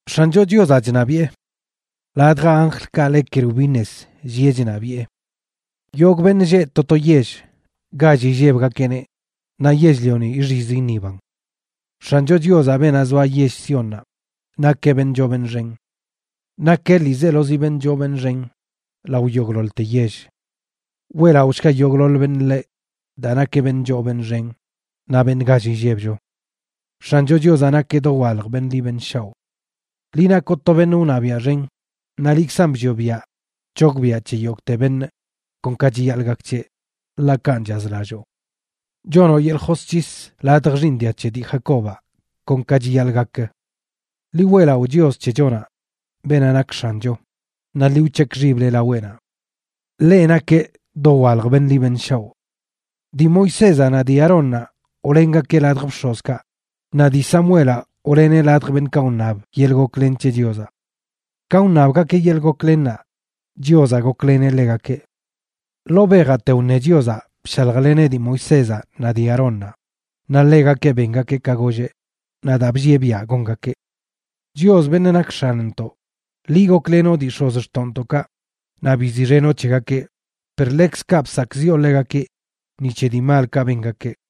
X̱ancho Chiozaꞌ chṉabiꞌe. Ladj anjlkaꞌ le kerubines llieꞌ chṉabiꞌe. Yogꞌ beṉꞌ lleꞌ to to yell gall illebgakeꞌneꞌ, naꞌ yell-lioni ixiz iṉiban. X̱ancho Chiozaꞌ, beenaꞌ zoa yell Siónnaꞌ, nakeꞌ beṉꞌ choo beṉꞌ xen, nakeꞌ ḻiizelozi beṉꞌ choo beṉꞌ xen lao yogꞌḻoḻte yell. Weꞌlaꞌoshga yogꞌḻoḻ beṉꞌ ḻeꞌ, daa nakeꞌ beṉꞌ choo beṉꞌ xen naꞌ beṉꞌ gall illebcho. ¡X̱ancho Chiozaꞌ nakeꞌ dowalj beṉꞌ ḻi beṉꞌ shaoꞌ! Liꞌ nakoꞌ to beṉꞌ wṉabiaꞌ xen naꞌ liꞌkzan bllioꞌ biaꞌ c̱hogbiꞌa c̱he yogꞌte beṉꞌ kon ka chiyaḻꞌ gak c̱heꞌ, ḻaꞌ kanꞌ chazlalloo. Chonoꞌ yeḻꞌ josc̱his ladj xiiṉ dia c̱he dii Jacobaꞌ kon ka chiyaḻꞌ gak. ¡Ḻi weꞌlaꞌo Chios c̱hechonaꞌ, beenaꞌ nak X̱ancho, naꞌ ḻi wc̱hekꞌ xible laweꞌnaꞌ! ¡Ḻeꞌ nakeꞌ dowalj beṉꞌ ḻi beṉꞌ shaoꞌ! Dii Moisézaꞌ naꞌ dii Aarónnaꞌ wlengakeꞌ ladj bx̱ozkaꞌ, naꞌ dii Samuelaꞌ wleneꞌ ladj beṉꞌkaꞌ wṉab yeḻꞌ goklen c̱he Chiozaꞌ. Ka wṉabgakeꞌ yeḻꞌ goklennaꞌ, Chiozaꞌ gokleneꞌ ḻegakeꞌ. Ḻoo bejaꞌte wṉe Chiozaꞌ bshaljleneꞌ dii Moisézaꞌ naꞌ dii Aarónnaꞌ, naꞌ ḻegakeꞌ bengakeꞌ ka golleꞌ naꞌ daa bllieꞌ biaꞌ gongakeꞌ. Chios, beṉꞌ nak X̱anntoꞌ, liꞌ goklenoꞌ dii x̱ozxtoꞌntoꞌkaꞌ naꞌ biziꞌxenoꞌ c̱hegakeꞌ, per ḻekzkaꞌ bsakꞌziꞌo ḻegakeꞌ ni c̱he dii malkaꞌ bengakeꞌ.